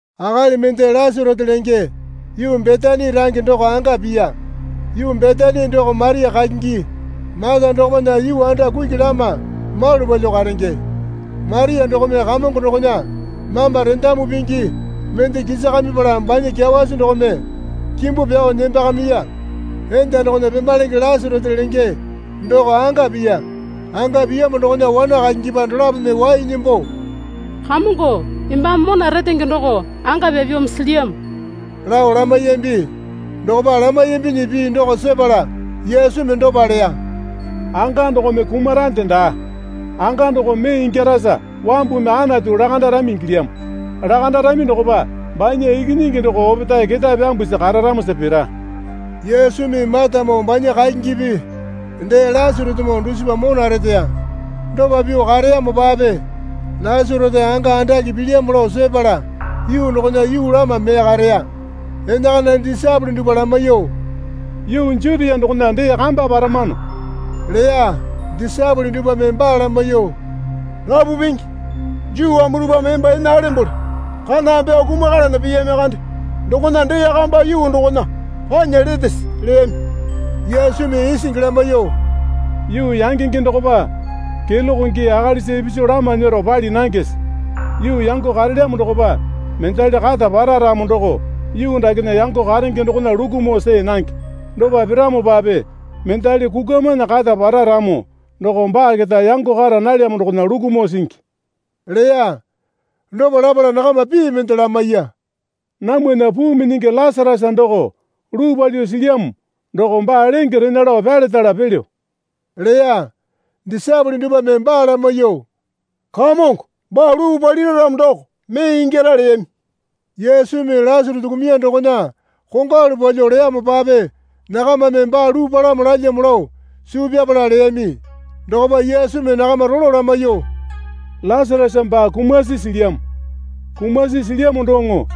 Akali mende Lasarasa lenge yuu Betani range doko anga piya. Yuu Betani doko Maria kakingi Mata dokopana yuu anda kuki lama malu palyuo karenge. (Maria dokome Kamongo dokona mamba rendamu pingi mende kisakamipala banya kyawasi dokome kimbu pyao nembakamiya enda dokona pemalenge Lasarasa lenge doko anga piya.) Anga piyamo dokona wana kakingipa dolapome wai nembo, Kamongo embame mona retenge doko anga pyapyamo silyamo, lao lamaiyambi. Dokopa lamaiyambinyi pii doko sepala Yesumi dopa leya. Anga dokome kumarande daa. Anga doko mee ingyarasa wambumi Anatu lakandarami ingilyamo. Lakandarami dokopa banya Ikinyingi doko opetae ketae pyambusi kararamosa pira. Yesumi Matamoo banya kakingipi dee Lasarasamoo dusipa mona reteya. Dopa pyuo kareyamopape Lasarasa anga andake pilyamo lao sepala yuu dokona yuu lama mee kareya. Enakana disaepole dupwa lamaiyuo, Yuu Jutia dokona dee kamba paramano leya. Disaepole dupwame baa lamaiyuo, Rapu Pingi, Juu wambu dupwame emba ene alembole kaname pyao kumakalana piyami kande dokona dee kamba yuu dokona panya letese? leyami. Yesumi isingi lamaiyuo, Yuu yangenge dokopa keloke gii akalisa ipisu lama nyero pali nangese? Yuu yango karelyamo dokopa mendali kata para ramo doko yuu dakena yango karenge dokona lukumo see nange. Dopa piramopape mendali kukwamana kata para ramo doko baa keta yango kara nalyamo dokona lukumo singi leya. Dopa lapala nakama pii mende lamaiya. Namwana puu minyingi Lasarasa doko luu palyuo silyamo doko baa lenge rena lao pyaletala pelyo leya. Disaepole dupwame baa lamaiyuo, Kamongo baa luu palira ramo doko mee ingyara leyami. Yesumi Lasarasa kumuya dokona kongwalu palyuo leyamopape nakamame baa luu palamo lalyamo lao suu pyapala leyami. Dokopa Yesumi nakama rolo lamaiyuo, Lasarasa baa kumasi silyamo. Kumasi silyamo doŋo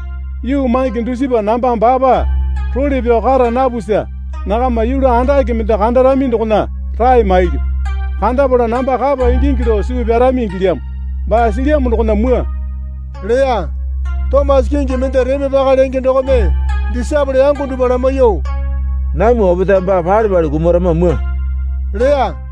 yuu mange dusipa namba baapa role pyao kara napusa nakama yulu andake mende kandarami dokona rae mailyu. Kandapala namba kapa ingingi lao suu pyarami ingilyamo. Baa silyamo dokona mwua, leya. Tomasa kingi mende Reme Paka lenge dokome disaepole yango dupwa lamaiyuo, Namwa opetae baa pale pale kumarama mwua leya.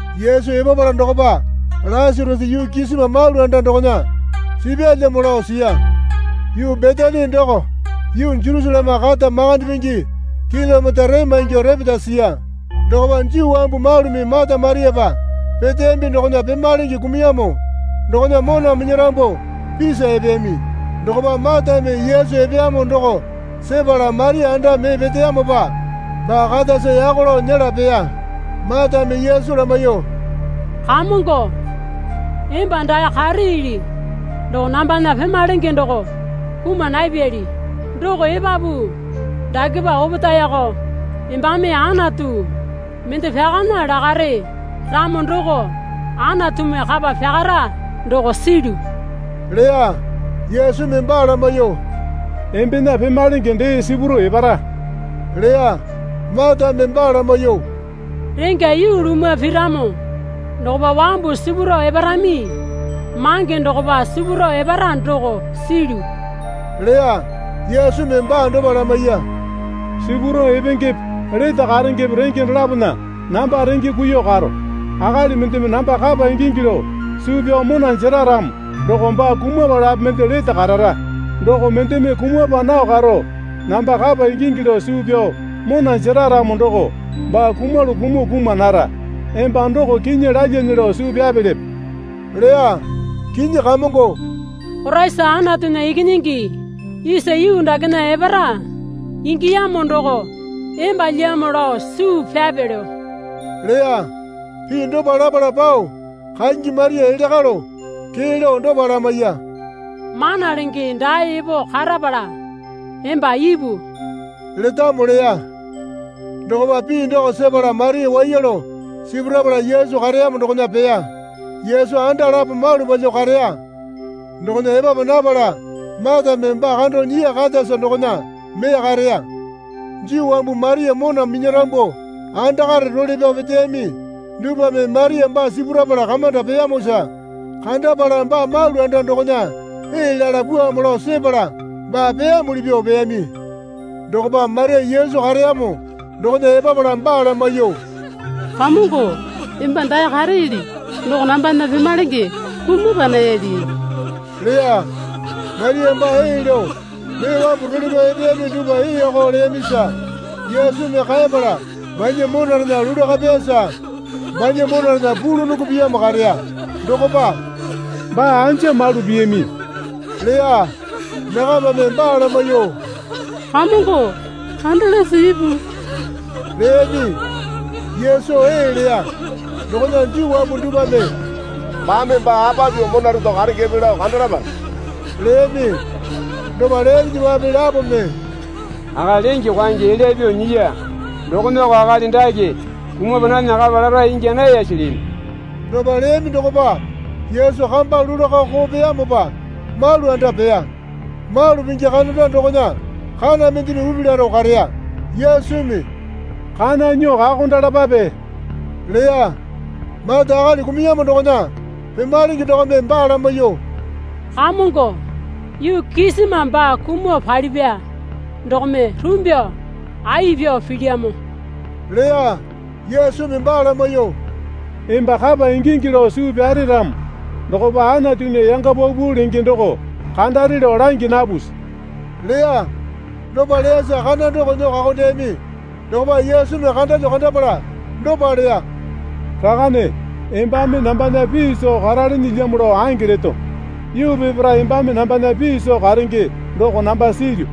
Yesu epapala dokopa Lasarasa yuu kisima malu anda dokona sipyalyamo lao siya. Yuu Betani doko yuu Jerusaleme kata makande pingi kilomita rema ingyuo repeta siya. Dokopa Juu wambu malumi Mata Mariapa peteyambi dokona pemalenge kumuyamo dokona mona minyarambu pisa epeyami. Dokopa Matame Yesu epeyamo doko sepala Maria anda mee peteyamopa baa katasa yako lao nyela peya. Matame Yesu lamaiyuo, Kamongo, emba dae kareeli doko nambana pemalenge doko kuma napyali. Doko epapu dakepa opetaeko embame Anatu mende pyakana lakare ramo doko Anatumi kapa pyakara doko silyu leya. Yesumi baa lamaiyuo, Embena pemalenge dee sipurao epara leya. Matame baa lamaiyuo, Rengya yuu lumwa piramo dokopa wambu sipurao eparami mange dokopa sipurao epara doko silyu, leya. Yesumi baa dopa lamaiya. Sipurao epengepe lete karengepe renge dolapona namba renge kuiyuo karo. Akali mendeme namba kapa ingingi lao suu pyao mona jera ramo doko baa kumapalape mende lete karara. Doko mendeme kumapa nao karo namba kapa ingingi lao suu pyao mona jera ramo doko baa kumalu kumuo kuma nara. Emba doko kinyi lalyane lao suu pyapelepe? leya. Kinyi Kamongo, Koraisa Anatunya Ikinyingi isa yuu dakena epara ingiyamo doko embalyamo lao suu pyapelyo leya. Pii dopa lapala pao kakingi Maria elya kalo kee lao dopa lamaiya. Mana Lenge dae epo karapala emba ipu letamo leya. Dokopa pii doko sepala Maria waiya lao sipurapala Yesu kareyamo dokona peya. Yesu anda lapo malu palyuo kareya dokona epapa napala Matame baa kando nyiya katasa dokona mee kareya. Juu wambu Maria mona minyarambu andakare role pyao peteyami dupwame Maria baa sipurapala kamanda peyamosa kandapala baa malu anda dokona ee lala pwuamo lao sepala baa peyamuli pyuo peyami. Dokopa Maria Yesu kareyamo dokona epapala baa lamaiyuo, Kamongo, emba dae kareeli doko nambana pemalenge kumapa nayali leya. Maria baa ee lao mee wambu role pyao epeyami dupwa eeko leyamisa Yesumi kaepala banya monarena lulaka peyasa banya monarena pulunongo piyamo kareya. Dokopa, Baa anja malu piyami? leya. Nakamame baa lamaiyuo, Kamongo, kandalase ipu, leyami. Yesu ee leya. Dokona Juu wambu dupwame, Baame baa apa pyuo mona reto karengepe lao kandalapa, leyami. Dopa leyaminyipape lapome, Akali lenge kwaenge elya pyuo nyiya dokomeko akali dake kumapa nana kapa lara ingya nayase? leyami. Dopa leyami dokopa Yesu kamba lulaka koo peyamopa malu anda peya. Malu pingi kananda dokona kana mendeme upi laro kareya. Yesumi, Kana nyuo kakondalapape, leya. Mata akali kumuyamo dokona pemalenge dokome baa lamaiyuo, Kamongo yuu kisima baa kumuo palipya dokome rumbyuo ai pyao pilyamo leya. Yesumi baa lamaiyuo, Emba kapa ingingi lao suu pyare ramo dokopa Anatunya yanga paupau lenge doko kandare lao langi napusi? leya. Dopa leyasa kana doko nyuo kakondeyami. Dokopa Yesumi kandalyuo kandapala dopa leya. Rakane embame nambana pii soo karalenelyamo lao ange leto. Yuu peparae embame nambana pii soo karenge doko namba silyu.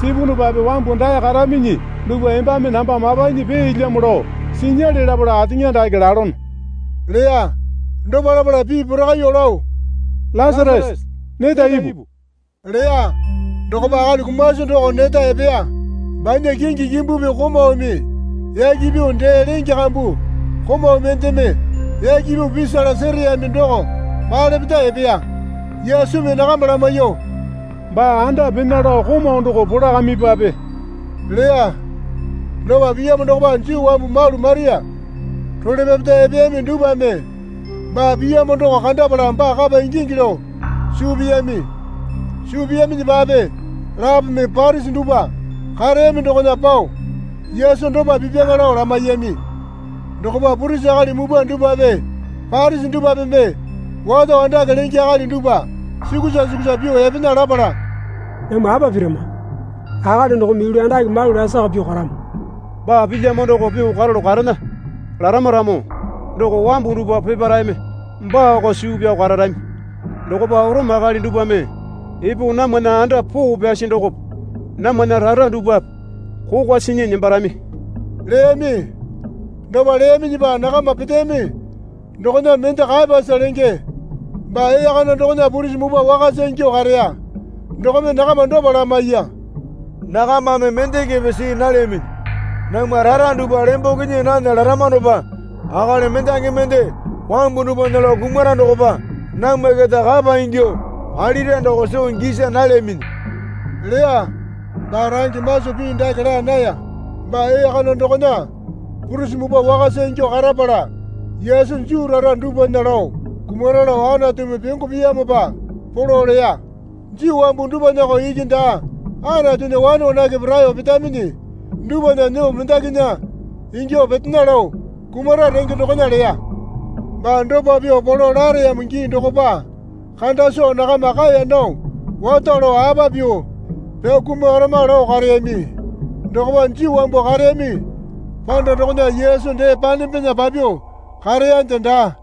Sipunupape wambu dae karaminyi dupwa embame namba mapanyi peelyamo lao sinyale lapala ateŋa dake lalono, leya. Dopa lapala pii porakaiyuo lao, Lasarasa, neta ipu leya. Dokopa akali kumasi doko neta epeya. Banya kingi kimbupi komaumi yaki pyuo dee lenge kambu komau mendeme yaki pyuo pisala sereyami doko palepeta epeya. Yesumi nakama lamaiyuo, Baa anda pena lao komau doko polakamipape leya. Dopa piyamo dokopa Juu wambu malu Maria role pyapeta epeyami dupwame baa piyamo doko kandapala baa kapa ingingi lao suu piyami. Suu piyaminyipape lapome Parisi dupwa kareyami dokona pao Yesu dopa pipyaŋa lao lamaiyami. Dokopa purisi akali mupwa dupwape Parisi dupwapeme wato andake lenge akali dupwa sukusa sukusa pyuo epena lapala, Namwa apa pirama? Akali dokome yulu andake malu lasaka pyuo karamo. Baa pilyamo doko pyuo karalu karena larama ramo doko wambu dupwa peparaeme baako suu pyao kararami dokopa Orome akali dupwame epo namwana anda poo pyasi dokope namwana rara dupwape kokwa sinyi nembarami leyami. Dopa leyaminyipa nakama peteyami dokona mende Kayapasa lenge baa ee kana dokona purisi mupwa wakasa ingyuo kareya dokome nakama dopa lamaiya. Nakamame mendekepe see nalyaminyi. Namwa rara dupwa lemboke nyii nana laramanopa akali mendaki mende wambu dupwana lao kumara dokopa namwa keta kapa ingyuo palira doko soo gisa nalyaminyi leya. (Baa range maso pii dake laa naya. Baa ee kana dokona purisi muwpa wakasa ingyuo karapala Yesu Juu rara dupwana lao kumara lao Anatumi pyongo piyamopa polo leya. Juu wambu dupwanako iki daa Anatunya wane wanake raeyo petaminyi dupwa nyuo mendakinya ingyuo petena lao kumara renge dokona leya.) Baa dopa pyuo polo lareyamo gii dokopa kanda soo nakama kaeya nao wato lao apa pyuo pyao kumakarama lao kareyami. Dokopa Juu wambu kareyami panda dokona Yesu dee panembena papyuo kareyande daa.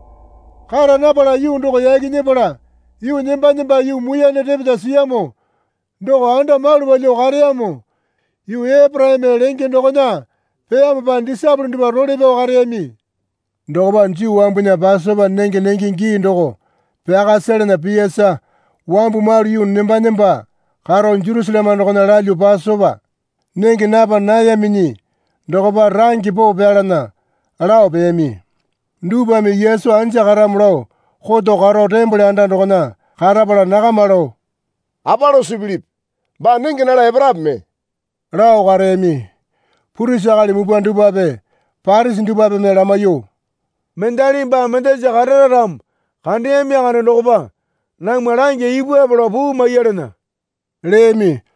Kara napala yuu doko yaki nyepala yuu nemba nemba yuu muiyane repeta siyamo doko anda malu palyuo kareyamo yuu Eporaime lenge dokona peyamopa disaepole dupwa role pyao kareyami. Dokopa Juu wambunya Pasopa nenge nenge gii doko pyaka selana piyasa wambu malu yuu nemba nemba karo Jerusaleme dokona lalyuo Pasopa nenge napa nayaminyi dokopa range poo pyalana lao peyami. Dupwame Yesu anja karamo lao koto karo tembole anda dokona karapala nakama lao, Apa lao suu pilipi? Baa nenge nala eparape mee? lao kareyami. Purisi akali mupwa dupwape Parisi dupwapeme lamaiyuo, Mendalimi baa mendasa karara ramo kandeyami kande dokopa namwa langya ipupwape lao puu maiyalana leyami.